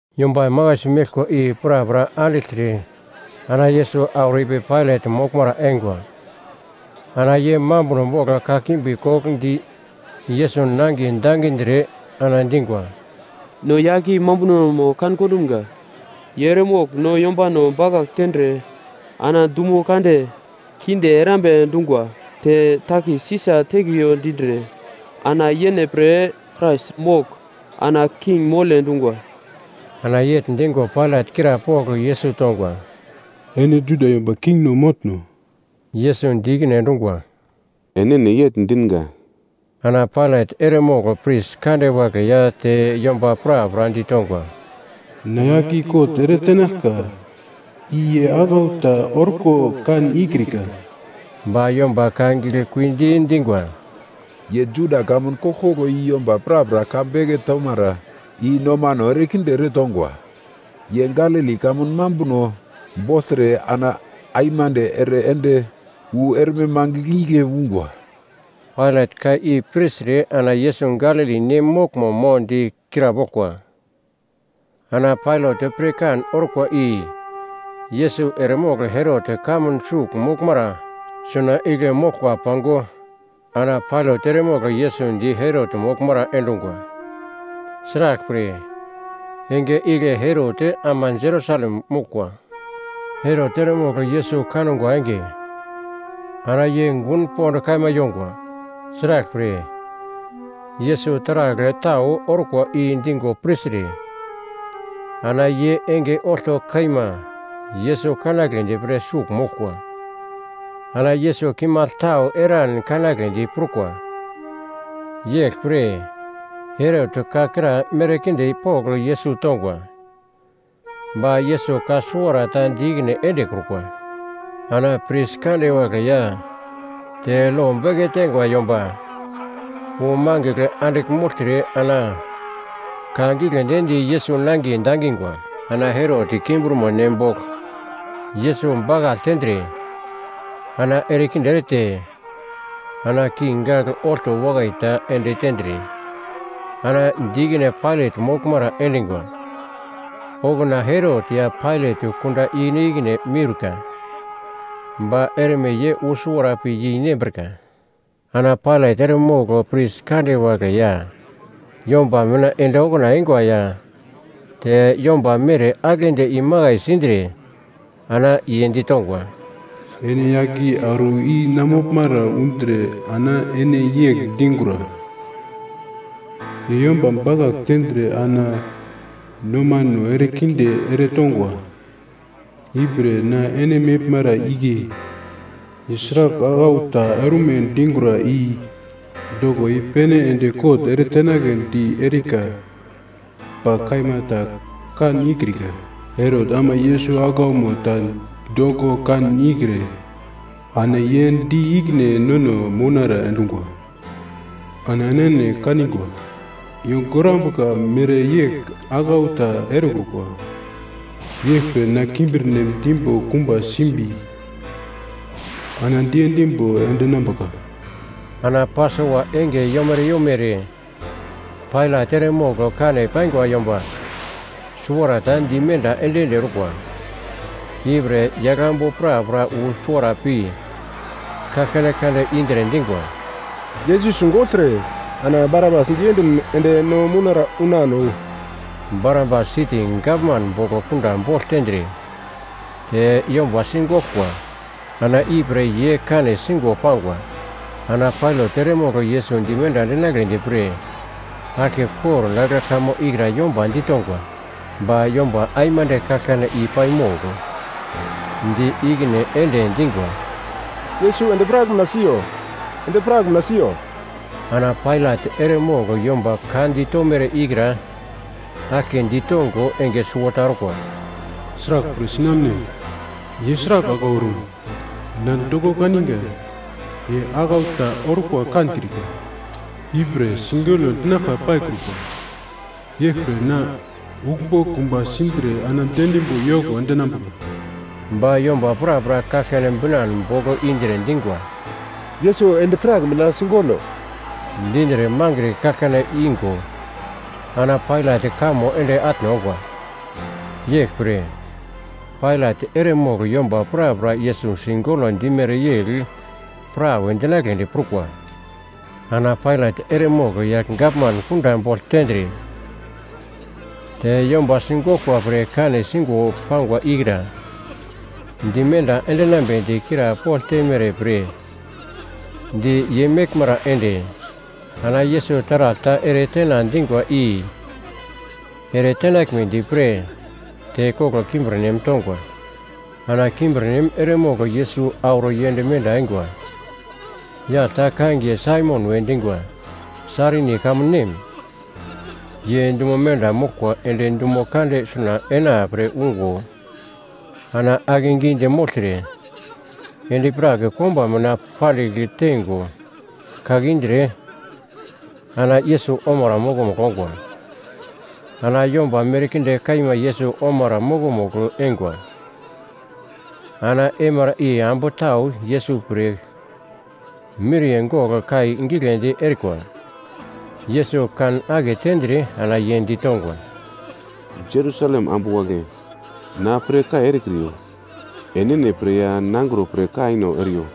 Yomba makaisi meglkwa i prapra andigltre ana Yesus auro ipi Pailat moglmara eingwa. Ana ye mambuno bogl kakimbi kogl di Yesus nangiye dangindre, ana dingwa, “No yagl i mambunomo kan kondumga. Ye eremogl no yombano bakagl tendre ana dumo kande kinde erambe dungwa te takis Sisa tekriyo dindre, ana yene pre Krais mogl, ana king mole dungwa.” Ana yegl dingo Pailat krapogl Yesus tongwa, “Ene Juda yomba kingno motno?” Yesus di ikine endungwa, “Enene yegl dinga.” Ana Pailat eremogl pris kande wagle ya te yomba prapra ditongwa, “Na yagl i kot ere tenaglka, i ye aglau ta orko kan ikrika.” Ba yomba ka giglekuidi dingwa, “Ye Judia kamun koglkoglo i yomba prapra ka beke tomara i nomano erekinde eretongwa. Ye Galili kamun mambuno bogltre ana aimande ere ende wu erme mangigl igle ungwa.” Pailat ka i pirtre ana Yesus Galili nem moglmo mo di krapoglkwa. Ana Pailat pirkan orkwa i Yesus eremogl Herot kamun sugl moglmara suna igle moglkwa pango ana Pailat eremogl Yesus di Herot moglmara endungwa. Sraglpre, enge igle Herot ama Jerusalem moglkwa. Herot eremogl Yesus kangwa enge, ana ye gun pond kaima yongwa. Sraglpre, Yesus taragl tau orkwa i dingo pirtre, ana ye enge olto kaima Yesus kanagledi pre sugl moglkwa. Ana Yesus kimagl tau eran kanagledi prukwa. Yeglpre, Herot ka kra merkinde pogl Yesus tongwa. Ba Yesus ka suwarata di ikine endekrukwa. Ana pris kande wagle ya te lo beke teingwa yomba wu mangigl andigl mogltre ana ka giglendi di Yesus nangiye dangingwa. Ana Herot kimbirmo nem bogl Yesus bakagl tendre, ana erekinde erete, ana king gagl olto wakai ta ende tendre, ana di ikine Pailat moglmara endingwa. Okuna Herot ya Pailat kunda ikine-ikine miurka, ba erme ye wu suwara pi yeinembrika. Ana Pailat eremogl pris kande wagle ya yomba mina ende okuna eingwa ya te yomba mere aglendi imakai sindre, ana ye ditongwa, “Ene yagl i auro i na moglmara undre ana ene yegl dingura, ‘Ye yomba bakagl tendre ana nomano erekinde eretongwa.’ Ipre na ene meglmara igle ye sragl aglau ta orme dingura i doko i-pene ende kot eretenagledi erika, ba kaima ta kan ikrika. Herot ama Yesus aglaumo ta doko kan ikre, ana ye di ikine nono mounara endungwa. Ana enene kanigwa, ye gorambuka mereyegl aglau ta erekrukwa. Yeglpre na kimbirnem dimbo kumba simbi, ana diendimbo endinambuka.” Ana Pasova enge yomere yomere Pailat eremogl kane paingwa yomba suwarata dimenda ende-ende orkwa. Ipre yaglambu prapra wu suwara pi kaglkane kande indre dingwa, “Yesus sigogltre, ana Barabas diendin ende no mounara unano.” (Barabas siti gavman bogl kunda bogl tendre, te yomba sigoglkwa ana ipre ye kane singo pangwa.) Ana Pailat eremogl Yesus dimenda endinagledi pre aglke kordagl kamo ikra yomba ditongwa. Ba yomba aimande kaglkane i paimogl di ikine ende dingwa, “Yesus endi-prak mina siyo! Endi-prak mina siyo!” Ana Pailat eremogl yomba ka ditomere ikra aglke ditongo enge suwota orkwa, “Sraglpre sinamune? Ye sragl aglau orum? Na doko kaninga ye aglau ta orko kankrika, ipre sigolo dinaglka paikrukwa. Yeglpre na uglmbo kumba sindre ana diendimbo yoko endinambuka.” Ba yomba prapra kaglkane binan bogl indre dingwa, “Yesus endi-prak mina sigolo” dindre mangre kaglkane ingo ana Pailat kamo ende atne ongwa. Yeglpre, Pailat eremogl yomba prapra Yesus sigolo dimere yegl prawe dinagledi prukwa. Ana Pailat eremogl yagl gavman kunda bogl tendre, te yomba sigoglkwa pre kane singo pangwa, ikra dimenda endinambedi krapogl teimere pre di ye meglmara ende, ana Yesus taragl ta eretena dingwa i ere tenaglmedi pre, tekoglo kimbirnem tongwa. Ana kimbirnem eremogl Yesus auro yend menda eingwa. Yagl ta kangiye Saimon we dingwa, Sairini kamun nem. Ye dumo menda moglkwa ende dumo kande suna enapre ungo, ana akegidi mogltre, endi-prak komba mina pandigl teingo kake indre, ana Yesus omara mokomugl ongwa. Ana yomba merkinde kaima Yesus omara mokomugl eingwa. Ana eimara i ambu tau Yesus pre miriye gogl kai giglendi erikwa. Yesus kan aketendre ana ye ditongwa, “Jerusalem ambu wagle, na pre kai erekriyo, enene pre ya nangro pre kaino eriyo.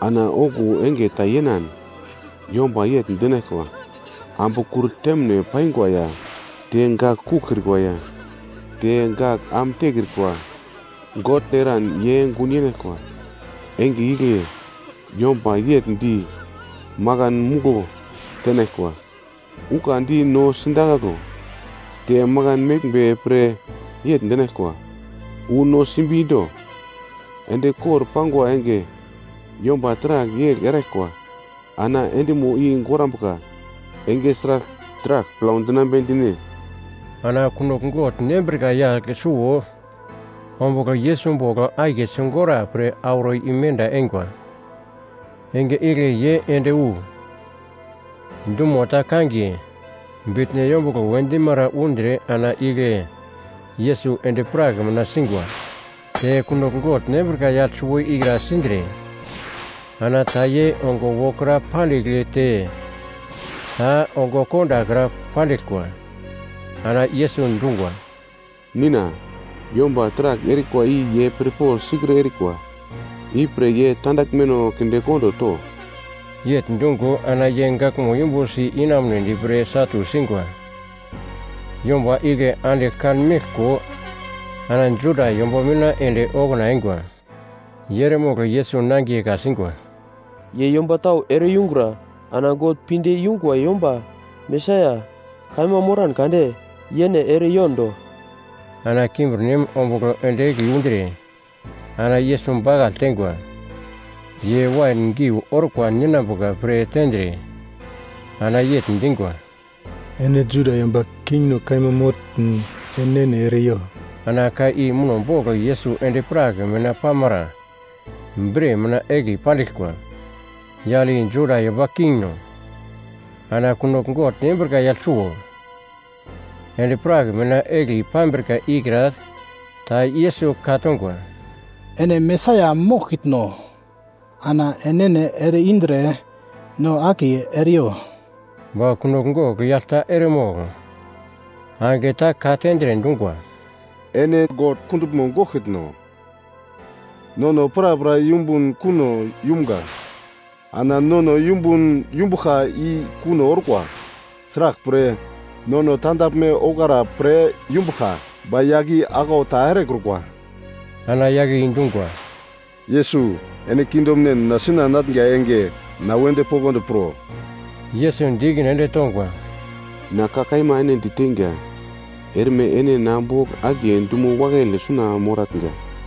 Ana okuwo enge ta yenan yomba yegl dinaglkwa, ‘Ambu kur temine paingwa ya, te gak kuglkrikwa ya, te gak am tekrikwa God eran ye gun yenaglkwa!’ Enge igle, “‘yomba yegl di, makan muglo tenaglkwa, “Ukandi no sindakaglo!” te Makan meglmbe pre yegl dinaglkwa, “Wu no simbi do!” ’ Endi kor pangwa enge yomba taragl yegl eraglkwa, ana endimo i gorambuka enge sragl taragl plau dinambe dine?” Ana kunogl gogl nembrika yagl suwo ombugl Yesus bogl akiye sigora pre auro imenda eingwa. Enge igle ye ende wu, dumo ta kangiye “Bitno Yombuglo” we dimara undre ana igle Yesus endi-prak mina singwa. Te kunogl gogl nembrika yagl suwo ikra sindre, ana ta ye ongo wokra pandigl te ta ongo kondakra pandiglkwa. Ana Yesus dungwa, “Nina, yomba taragl erikwa i ye pirpogl sikre erikwa. Ipre ye tandaglmeno kindekondo to.” Yegl dungo ana ye gaglmo yumbusi inamunedi pre satu singwa. Yomba igle andigl kanmeglko ana Juda yomba mina ende okuna eingwa ye eremogl Yesus nangiye ka-singwa, “Ye yomba tau ere-yungura, ana God pinde yungwa yomba Mesaia kaima moran kade yene ere-yondo.” Ana kimbirnem ombugl ende egli undre ana Yesus bakagl teingwa. Ye wain geu orkwa ninambuka pre tendre, ana yegl dingwa, “Ene Juda yomba kingno kaima motn enene ere-yo!” Ana ka i muno bogl Yesus endi-prak mina pamara bre mina egli pandiglkwa, “Yagl i Juda Yomba Kingno.” Ana kunogl gogl nembrika yagl suwo endi-prak mina egli pambrika ikra ta Yesus ka-tongwa, “Ene Mesaia moglkitno? Ana enene ere indre, no akiye ere-yo.” Ba kunogl gogl yagl ta eremogl angigle ta ka-tendre dungwa, “Ene God kunduglmo goglkitno? Nono prapra yumbun kuno yumga. Ana nono yumbun yumbuglka i kuno orkwa, sraglpre, nono tandaglme ouglara pre yumbuglka. Ba yagl i aglau ta erekrukwa.” Ana yagle i dungwa, “Yesus ene kingdomnen mina suna enatnga enge na wedi poglodi pro.” Yesus di ikine ende tongwa, “Na ka kaima ene diteinga, erme ene na bogl akiye dumo wakaile suna moratnga.”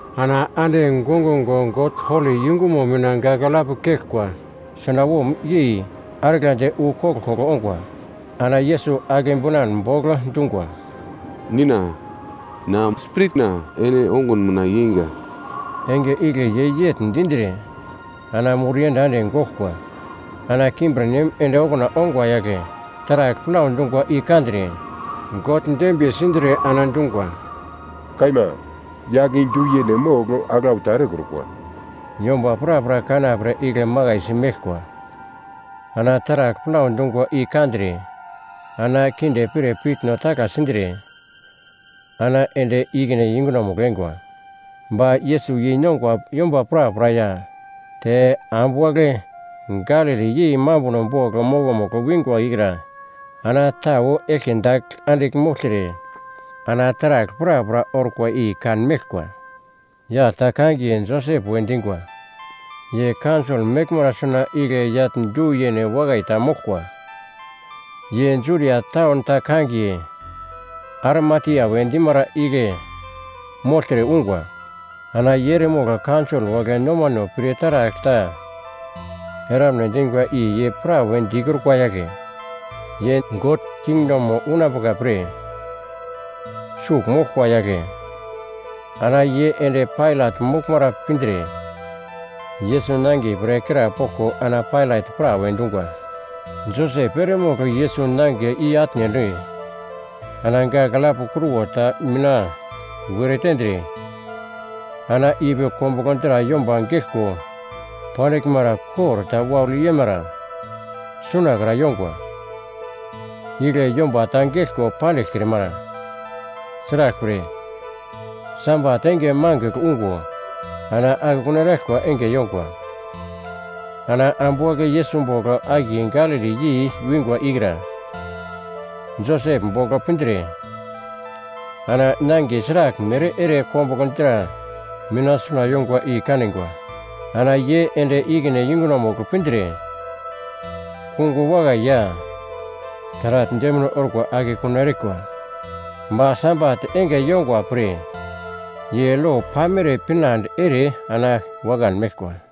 Ana ande gongungo God holi yungumo mina gagl alap keglkwa sunawom yei arglandi wu koglkoglo ongwa. Ana Yesus agle binan bogl dungwa, “Nina! Na spiritna ene ongun mina yeinga.” Enge igle ye yegl dindre, ana mur iyenda ende goglkwa. Ana kimbirnem ende okuna ongwa yagle taragl plau dungwa i kandre, God dembiye sindre ana dungwa, “Kaima, yagl i du-yene mogl aglau ta erekrukwa.” Yomba prapra kanapre igle makaisi meglkwa, ana taragl plau dungwa i kandre, ana kinde pir piutno tagla sindre, ana ende ikine yungunomugl eingwa. Ba Yesus yeinongwa yomba prapra ya, te ambu wagle Galili yei mambuno bogl mokomugl wingwa ikra ana tau eglke dagl andigl mogltre, ana taragl prapra orkwa i kanmeglkwa. Yagl ta kangiye Josep we dingwa. Ye kaunsol meglmara suna igle yagl du yene wakai ta moglkwa. Ye Judia taun ta kangiye Arimatia we dimara igle mogltre ungwa. Ana ye eremogl kaunsol wagle nomano pir taragl ta eramne dingwa i ye prawe dikrukwa yagle. Ye God kingdomo unambuka pre sugl moglkwa yagle. Ana ye ende Pailat moglmara pindre, Yesus nangiye pre krapoglko ana Pailat prawe dungwa. Josep eremogl Yesus nangiye i-atne ende, ana gagl alap kruwo ta mina were tendre, ana ipi kombuglo dra yomba geglko pandiglmara kor ta waugl yeimara sunakra yongwa. Igle yomba ta geglko pandiglkrimara. Sraglpre, Sabat enge mangigl ungo ana akekun eraglkwa enge yongwa. Ana ambu wagle Yesus bogl akiye Galili yei wingwa ikra Josep bogl pindre, ana nangiye sraglmere ere kombuglo dra mina suna yongwa i kanigwa. Ana ye ende ikine yungunomugl pindre, kungo wakai ya taragl demine orkwa akekun erikwa. Ba Sabat enge yongwa pre ye lo pamere pinande ere ana wakan meglkwa.